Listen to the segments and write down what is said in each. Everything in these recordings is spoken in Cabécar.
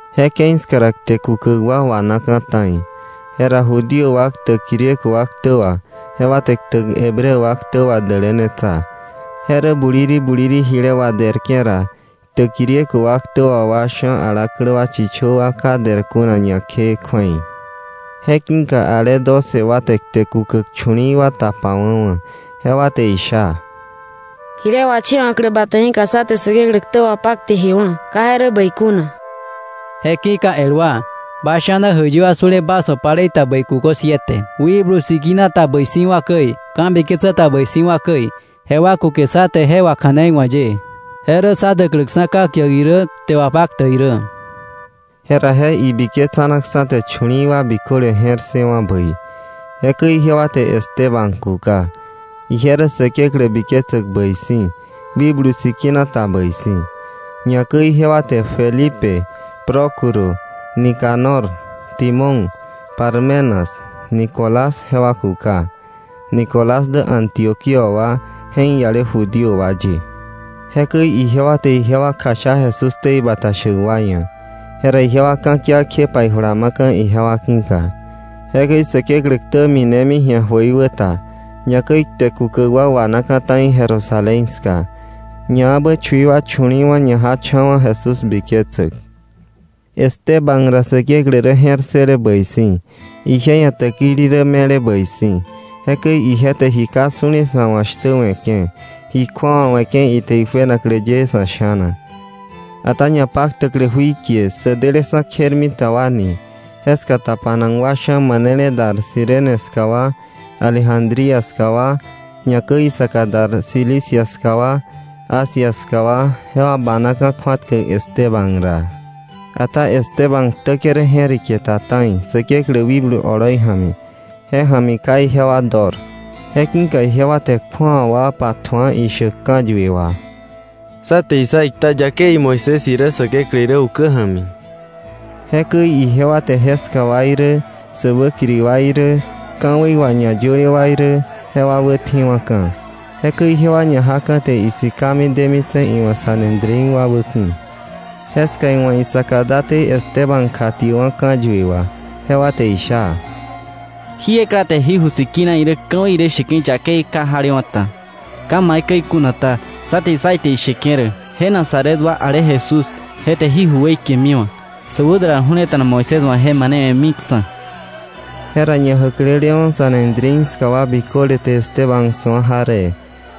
Je ke̱i ska ra kte kukäk wa wanaka̱ ta̱i. Jera Judío wa ktäk Griego wa ktä wà, jewa te ktäk Hebreo wa ktä wà wa dälänetsa, je rä buliri buliri jile waderke̱ ra, ktäk Griego wa ktä wà sha̱ alaklä wa chichö wa ka der kuna ñakjee kju̱ei. Je ki̱ka ale doce wa te kte kukäk chu̱li̱i̱ wa tapawa̱wa̱. Jewa te isha: —Jile wachewa̱klä bata ki̱ka sá te Säkeklä ktä wapakte jewa̱ ka je rä bäi kuna. Je ki̱ka el wa, bas sha̱na jäiyi wa su̱le bas wa̱ palei ta bäi kukö siete, Wikblu Sikina ta bäi si̱wa̱ käi, ka̱biketsä ta bäi si̱wa̱ käi. Jewa kuke sá te je wakja̱neiwa̱k ye. Je rä sá däkläksa̱ ka̱kiäk irä, kte wapaktäk irä. Jera je ibiketsanaksa̱ te chu̱li̱i̱ wa biköle je̱r ssëwa̱ bäi. Jekäi ijewa te Esteban kuka. Ije rä Säkeklä biketsäk bäi si̱, Wikblu Sikina ta bäi si̱. Ñakäi ijewa te Felipe, Prócuro, Nicanor, Timón, Parmenas, Nicolás jewa kuka. Nicolás dä Antioquía wa je̱k ialewa̱ Judío wa ye. Jekäi ijewa te jewa kjasha Jesús ktei bata shäk wa ia̱. Jera ijewa ka̱kia kjepa ijula ma̱ka̱ ijewa ki̱ka. Jekäi Säkeklä ktä minemi ji̱a jöiwäta. Ñakäi kte kukäk wa wanaka̱ ta̱i Jerusalén ska. Ñaebä chui wa chu̱li̱i̱wa̱ ñajacha̱wa̱ Jesús biketsäk. Esteban ra Säkeklä rä je̱r ssële bäi si̱, ije ia̱ täkili rä me̱le bäi si̱. Jekäi ije te ji ka su̱le sa̱ wa̱ shtä we̱ke̱, ji kju̱awa we̱ke̱ ite ijuenaklä ye sa̱ sha̱na. Ata ñapaktäklä jui kie “Sä Deleksa̱ Kjermita wa” jeska tapanak wa sha̱ manele dar Cirene ska wa, Alejandría ska wa, ñakäi isaka dar Cilicia ska wa, Asia ska wa, jewa banaka̱ kju̱atkäk Esteban ra. Ata Esteban ktäke̱ rä je̱riketa ta̱i Säkeklä wikblu oloi ja̱mi. Je ja̱mi ka ijewa dor. Je ki̱ka ijewa te kju̱awa wa patju̱a ishäk ka̱yue wà: “Sá te issa ikta yakei Moisés irä Säkeklä irä ukä ja̱mi.” Jekäi ijewa te jeska wa irä säwäkiri wa irä, ka̱wei wà ñayöle wa irä, jewa wätjiwa̱ka̱. Jekäi ijewa ñajaka̱ te isikami demitse̱ iwa̱ Sanedrín wa wäki̱. Jeska iwa̱ isaka date Esteban kjatiäkwa̱ ka̱yue wà. Jewa te isha: —Jí ekla te jí ju sikina irä, ka̱wei irä, sheke̱ yakei ka jalewa̱ ta. Ka irä maikäi kuna ta, sá te issa ite isheke̱ rä je Nazaret wa, ale Jesús je te jí ju weikemiwa̱, sä wädular ju̱leta̱na Moisés wa̱ je manewe̱miksa̱. Jera ñajäklelewa̱ Sanedrín ska wa biköle te Esteban su̱a jaree,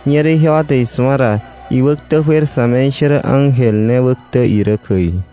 ñerä ijewa te isu̱a ra iwäktä juer sa̱me̱ishärä ángel ne wäktä irä käi.